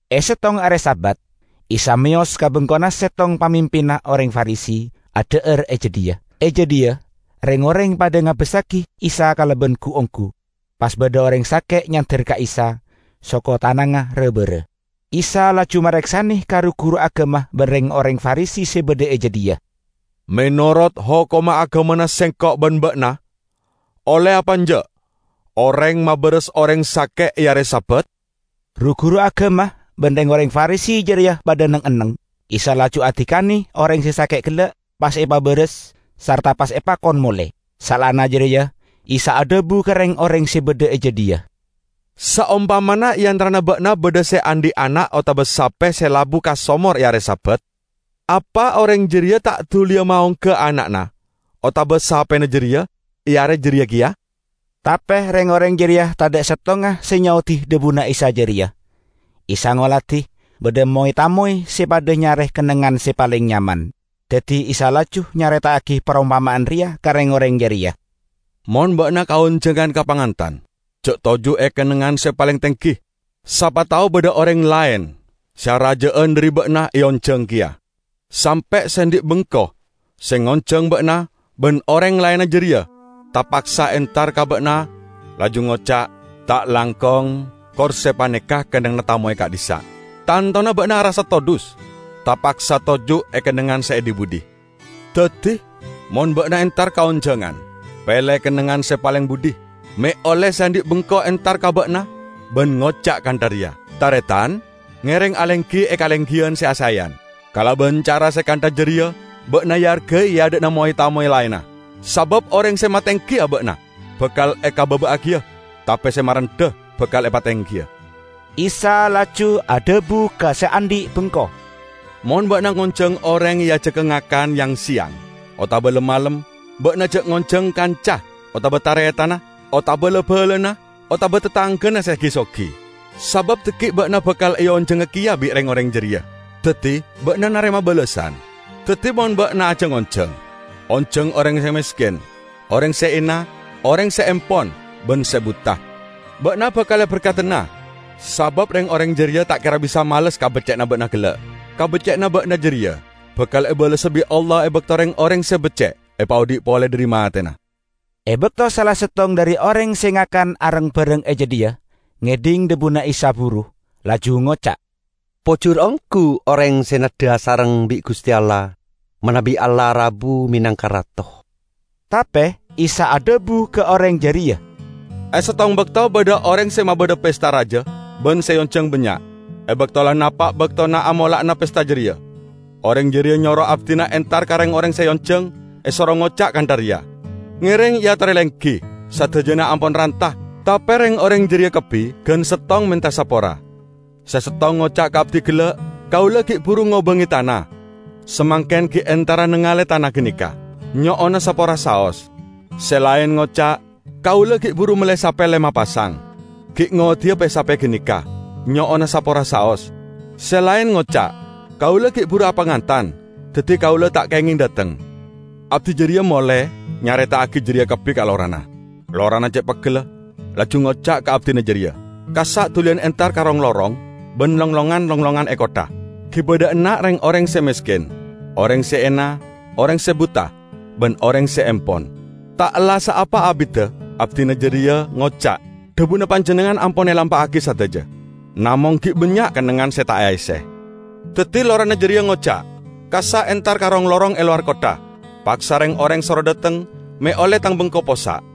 E settong are Sabat Isa meyos ka bengkona settong pamimpinna oreng Farisi, adha'ar e jadhiya. E jadhiya reng-oreng padha ngabassagi Isa kalaban gu-onggu. Pas badha oreng sake' nyander ka Isa, soko tanangnga ra-bara. Isa laju mareksane ka ru-guru agama ban reng-oreng Farisi se badha e jadhiya, "Menorot hokomma agamana Sengko' ban ba'na olle apa enja' oreng mabaras oreng sake' e are Sabat?" Ru-guru agama ban reng-oreng Farisi jareya padha neng-enneng. Isa laju adikane oreng se sake' gella', pas epabaras, sarta pas epakon mole. Saellana jareya Isa adhabu ka reng-oreng se badha e jadhiya, "Saompamana e antarana ba'na badha se andhi' ana' otaba sape se labu ka somor e are Sabat, apa oreng jareya ta' duliya maongga ana'na otaba sapena jareya e are jareya keya?" Tape reng-oreng jareya tadha' settonga se nyaodi dhabuna Isa jareya. Isa ngoladi badha moy-tamoy se padha nyare kennengngan se paleng nyaman. Daddi Isa laju nyareta'agi parompama'an reya ka reng-oreng jareya: "Mon ba'na kaonjangan ka pangantan, ja' toju' e kennengngan se paleng tenggi. Sapa tao badha oreng laen se araja'an dhari ba'na eonjang keya, sampe' se andhi' bengko se ngonjang ba'na ban oreng laenna jareya tapaksa entar ka ba'na laju ngoca', 'Ta' langkong, korse paneka kennengnganna tamoy ka'dhissa'.' Tantona ba'na arassa todhus tapaksa toju' e kennengngan se e dhi-budhi. Daddi, mon ba'na entar kaonjangan, pele kennengngan se paleng budhi, me' olle se andhi' bengko entar ka ba'na ban ngoca' kantha reya, 'Taretan, ngereng alenggi e kalenggiyan se asaeyan.' Kalaban cara se kantha jareya ba'na eargai e adha'na moy-tamoy laenna. Sabab oreng se matenggi aba'na bakal ekababa'agiya, tape se marendha bakal epatenggiya." Isa laju adhabu ka se andhi' bengko, "Mon ba'na ngonjang oreng eajaga ngakan yang-seyang otaba lem-malem, ba'na ja' ngonjang kanca otaba taretanna, otaba la-balana otaba tatanggana se gi-sogi. Sabab dhaggi' ba'na bakal eonjanga keya bi' reng-oreng jareya, daddi ba'na narema balessan. Daddi mon ba'na ajang-onjang, onjang oreng se mesken, oreng se ena, oreng se empon ban se buta. Ba'na bakal eberkadana sabab reng-oreng jareya ta' kera bisa males kabecce'anna ba'na gella'. Kabecce'anna ba'na jareya bakal ebalessa bi' Allah e bakto reng-oreng se becce' epaodhi' pole dhari matena." E bakto sala settong dhari oreng se ngakan areng-bareng e jadhiya ngedhing dhabuna Isa buru, laju ngoca', "Pojur onggu oreng se neddha asareng bi' Guste Allah manabi Allah rabu menangka Rato!" Tape Isa adhabu ka oreng jareya, "E settong bakto badha oreng se mabadha pesta raja, ban se eonjang bannya'. E bakto la napa' baktona amola'ana pesta jareya, oreng jareya nyoro abdina entar ka reng-oreng se eonjang, esoro ngoca' kantha reya, 'Ngereng eatore lenggi, sadajana ampon ranta!' Tape reng-oreng jareya kabbi gan settong menta sapora. Se settong ngoca' ka abdi gella', 'Kaula gi' buru ngobange tana, samangken gi' entara nengale tana ganeka. Nyo'ona sapora saos.' Se laen ngoca', "Kaula gi' buru melle sape lema pasang, gi' ngoddiya pe-sape ganeka. Nyo'ona sapora saos." Se laen ngoca', 'Kaula gi' buru apangantan, daddi kaula ta' kengeng dhateng.' Abdi jareya mole nyareta'agi jareya kabbi ka lorana. Lorana ce' peggella, laju ngoca' ka abdina jareya, 'Kassa' duliyan entar ka rong-lorong ban longlongan-longlongan e kottha. Giba dha' enna' reng-oreng se mesken, oreng se ena, oreng se buta ban oreng se empon.' Ta' ella' saapa abidda abdina jareya ngoca', 'Dhabuna panjennengngan ampon elampa'agi sadaja, namong gi' bannya' kennengngan se ta' aesse.' Daddi lorana jareya ngoca', 'Kassa' entar ka rong-lorong e lowar kottha, paksa reng-oreng soro dhateng, me' olle tang bengko possa'.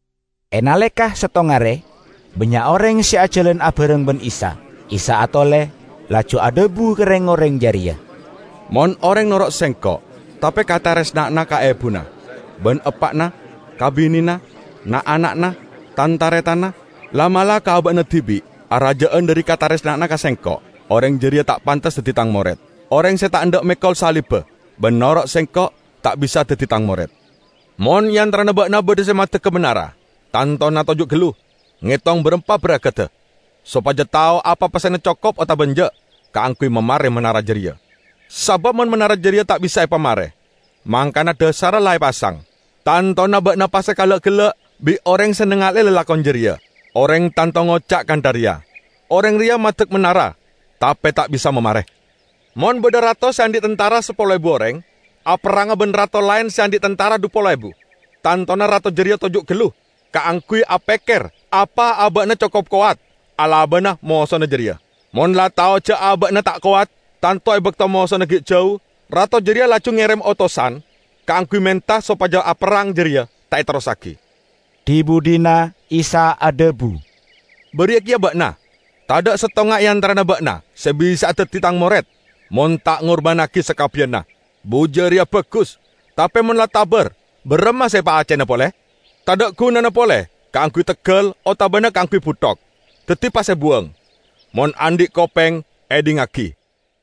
E naleka settong are bannya' oreng se ajalan abareng ban Isa. Isa atole laju adhabu ka reng-oreng jareya, "Mon oreng noro' Sengko', tape kataresna'anna ka ebuna ban eppa'na, ka binena, na'-ana'na, tan-taretanna, la'-mala' ka aba'na dibi' araja'an dhari kataresna'anna ka Sengko', oreng jareya ta' pantes daddi Tang mored. Oreng se ta' endha' mekol salibba ban noro' Sengko', ta' bisa daddi Tang mored. Mon e antarana ba'na badha se maddegga manara, tantona toju' gallu, ngetong barampa baragadda, sopaja tao apa pessena cokop otaba enja' kaangguy mamare manara jareya. Sabab mon manara jareya ta' bisa epamare, mangkana dhasarra la epasang, tantona ba'na pas ekala'-gella' bi' oreng se nangale'e lalakon jareya. Oreng tanto ngoca' kantha reya, 'Oreng reya maddek manara tape ta' bisa mamare!' Mon badha rato se andhi' tantara sapolo ebu oreng aperranga ban rato laen se andhi' tantara dhu polo ebu, tantona rato jareya toju' gallu kaangguy apekker apa aba'na cokop kowat alabana mosona jareya. Mon la tao ja' aba'na ta' kowat, tanto e bakto mosona gi' jau, rato jareya laju ngerem otosan kaangguy menta sopaja aperrang jareya ta' eterrossagi." Dhi-budhina Isa adhabu, "Bariya keya ba'na. Tadha' settonga e antarana ba'na se bisa'a daddi Tang mored, mon ta' ngurbannagi sakabbiyanna." "Buja reya bagus, tape mon la tabar, baramma se epaaccena pole? Tadha' gunana pole kaangguy teggal otabana kaangguy buthok. Daddi pas ebuwang. Mon andhi' kopeng, edhingngagi!"